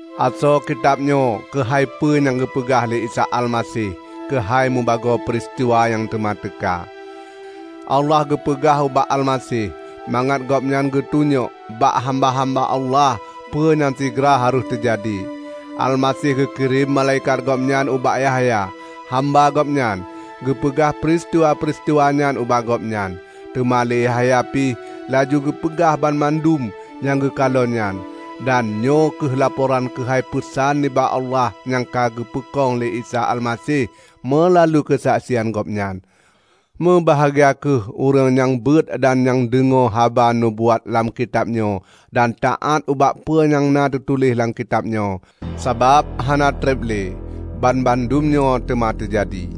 Asoe kitab nyoe keuhai peue nyang geupeugah lé Isa Almaseh keuhai meubagoe peuristiwa nyang teuma teuka. Allah geupeugah ubak Almaseh mangat Gobnyan geutunyok bak hamba-hamba Allah peue nyang sigra harôh teujadi. Almaseh geukirém malaikat Gobnyan ubak Yahya, hamba Gobnyan, keugeupeugah peuristiwa-peuristiwa nyan ubak gobnyan. Teuma lé Yahya pih laju geupeugah banmandum nyang geukalon nyan; dan nyoe kheueh laporan keuhai peusan nibak Allah nyang ka geupeukong lé Isa Almaseh meulalu keusaksian Gobnyan. Meubahgia kheueh ureuëng nyang beuet dan nyang deungoe haba nubuat lam kitab nyoe dan taát ubak peue nyang na teutuléh lam kitab nyoe. Sabab hana treb lé banmandum nyoe teuma teujadi.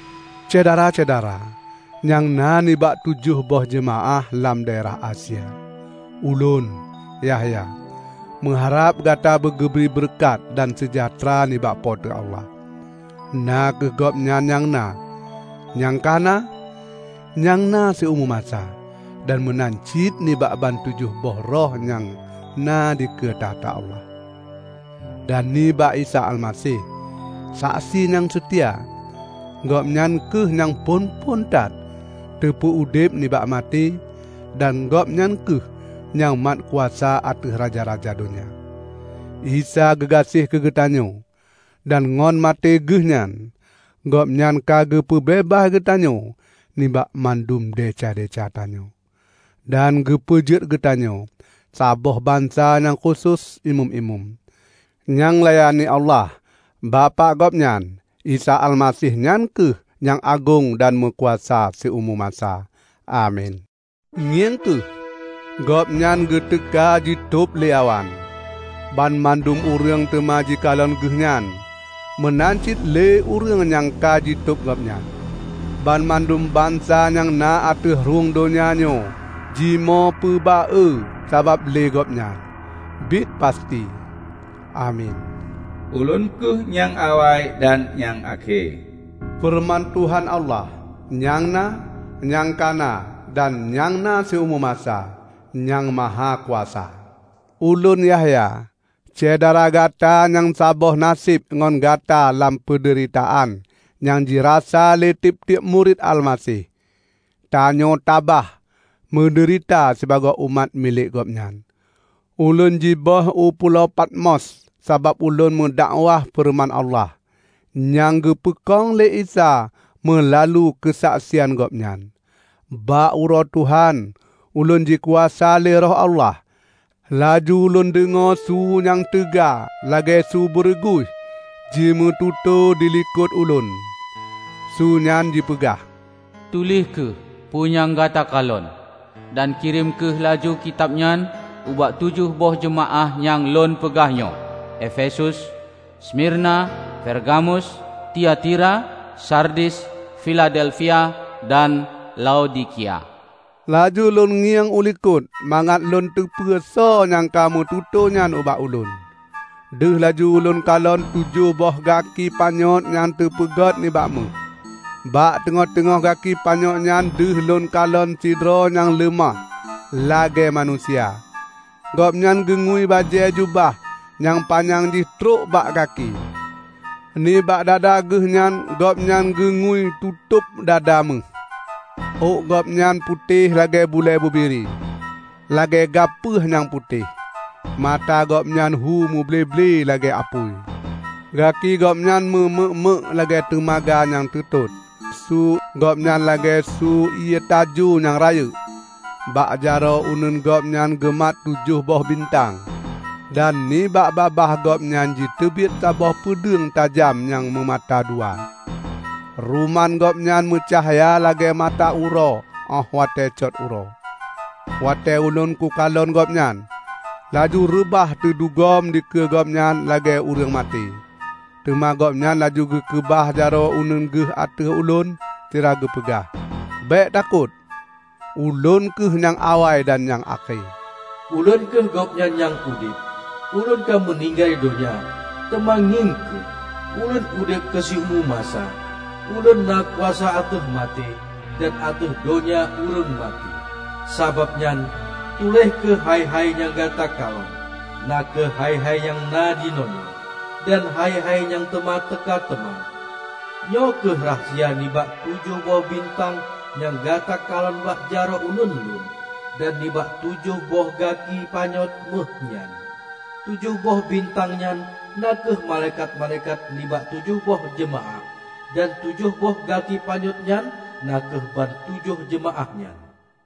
Syedara-syedara nyang na nibak tujoh boh jeumaáh lam daerah Asia! Ulôn, Yahya, meuharab gata beugeubri beureukat dan seujahteura nibak Po teu Allah -- na kheueh Gobnyan nyang na, nyang ka na, dan nyang na siumu masa -- dan meunan cit nibak bantujoh boh roh nyang na dikeue takhta Allah, dan nibak Isa Almaseh, saksi nyang seutia. Gobnyan kheueh nyang phon-phon that teupeu-udeb nibak maté dan Gobnyan kheueh nyang mat kuasa ateueh raja-raja donya. Isa geugaséh keugeutanyoe, dan ngon maté Geuhnyan Gobnyan ka geupeubeubaih geutanyoe nibak mandum desya-desya tanyoe, dan geupeujeuet geutanyoe saboh bansa nyang khusos imeum-imeum, nyang layani Allah, Bapak Gobnyan, Isa Almaseh nyan kheueh nyang agong dan meukuasa siumu masa. Amin! Ngieng kheueh, Gobnyan geuteuka jitôb lé awan! Banmandum ureuëng teuma jikalon Geuh nyan, meunan cit lé ureuëng nyang ka jitôb Gobnyan. Banmandum bansa nyang na ateueh rhueng donya nyoe jimoe peuba-e sabab lé Gobnyan. Biet, pasti! Amin! "Ulôn kheueh nyang awai dan nyang akhé," feureuman Tuhan Allah, nyang na, nyang ka na, dan nyang na siumu masa, Nyang Mahakuasa. Ulôn Yahya, syedara gata nyang saboh naseb ngon gata lam peudeuritaan nyang jirasa lé tieb-tieb murit Almaseh. Tanyoe tabah meudeurita sibagoe umat milék Gobnyan. Ulôn jiböih u pulo Patmos sabab ulôn meudakwah feureuman Allah, nyang geupeukong lé Isa meulalu keusaksian Gobnyan. Bak uroe Tuhan, ulôn jikuasa lé Roh Allah, laju lôn deungoe su nyang teuga -- lagée su beureuguih -- jimeututoe dilikot ulôn. Sue nyan jipeugah, "Tuléh kheueh peue nyang gata kalon, dan kirém kheueh laju kitab nyan ubak tujoh boh jeumaáh nyang lôn peugah nyoe: Efesus, Smirna, Pergamus, Tiatira, Sardis, Filadelfia, dan Laodikia." Laju lôn ngieng u likot mangat lôn teupeue soe nyang ka meututoe nyan ubak ulôn. Deuh laju lôn kalon tujoh boh gaki panyöt nyang teupeugét nibak méuh. Bak teungoh-teungoh gaki panyöt nyan deuh lôn kalon sidroe nyang leumah lagée manusia. Gobnyan geungui bajée jubah nyang panyang jih trok bak gaki. Nibak dada Geuhnyan Gobnyan geungui tutôb dada méuh. Ôk Gobnyan putéh lagée bulée bubiri, lagée gapeueh nyang putéh. Mata Gobnyan hu muble-ble lagée apui; gaki Gobnyan meu meuek-meuek lagée teumaga nyang teutot. Su Gobnyan lagée su ié tajo nyang rayeuk. Bak jaroe uneuen Gobnyan geumat tujoh boh bintang, dan nibak babah Gobnyan jiteubiet saboh peudeueng tajam nyang meumata dua. Ruman Gobnyan meucahya lagée mata uroe óh watée cot uroe. Watée ulôn kukalon Gobnyan, laju reubah teudugom dikeue Gobnyan lagée ureuëng maté. Teuma Gobnyan laju geukeubah jaroe uneuen Geuh ateueh ulôn sira geupeugah, "Bék takot! Ulôn kheueh nyang awai dan nyang akhé. Ulôn kheueh Gobnyan nyang udeb! Ulôn ka meuninggai donya, teuma ngieng kheueh, Ulôn udeb keusiumu masa. Ulôn na kuasa ateueh maté, dan ateueh donya ureuëng maté. Sabab nyan, tuléh kheueh hai-hai nyang gata kalon, na kheueh hai-hai nyang na jinoenyoe, dan hai-hai nyang teuma teuka teuma. Nyoe kheueh rahsia nibak tujoh boh bintang nyang gata kalon bak jaroe uneuen Lôn, dan nibak tujoh boh gaki panyöt méuh nyan: Tujoh boh bintang nyan na kheueh malaikat-malaikat nibak tujoh boh jeumaáh, dan tujoh boh gaki panyöt nyan na kheueh ban tujoh jeumaáh nyan."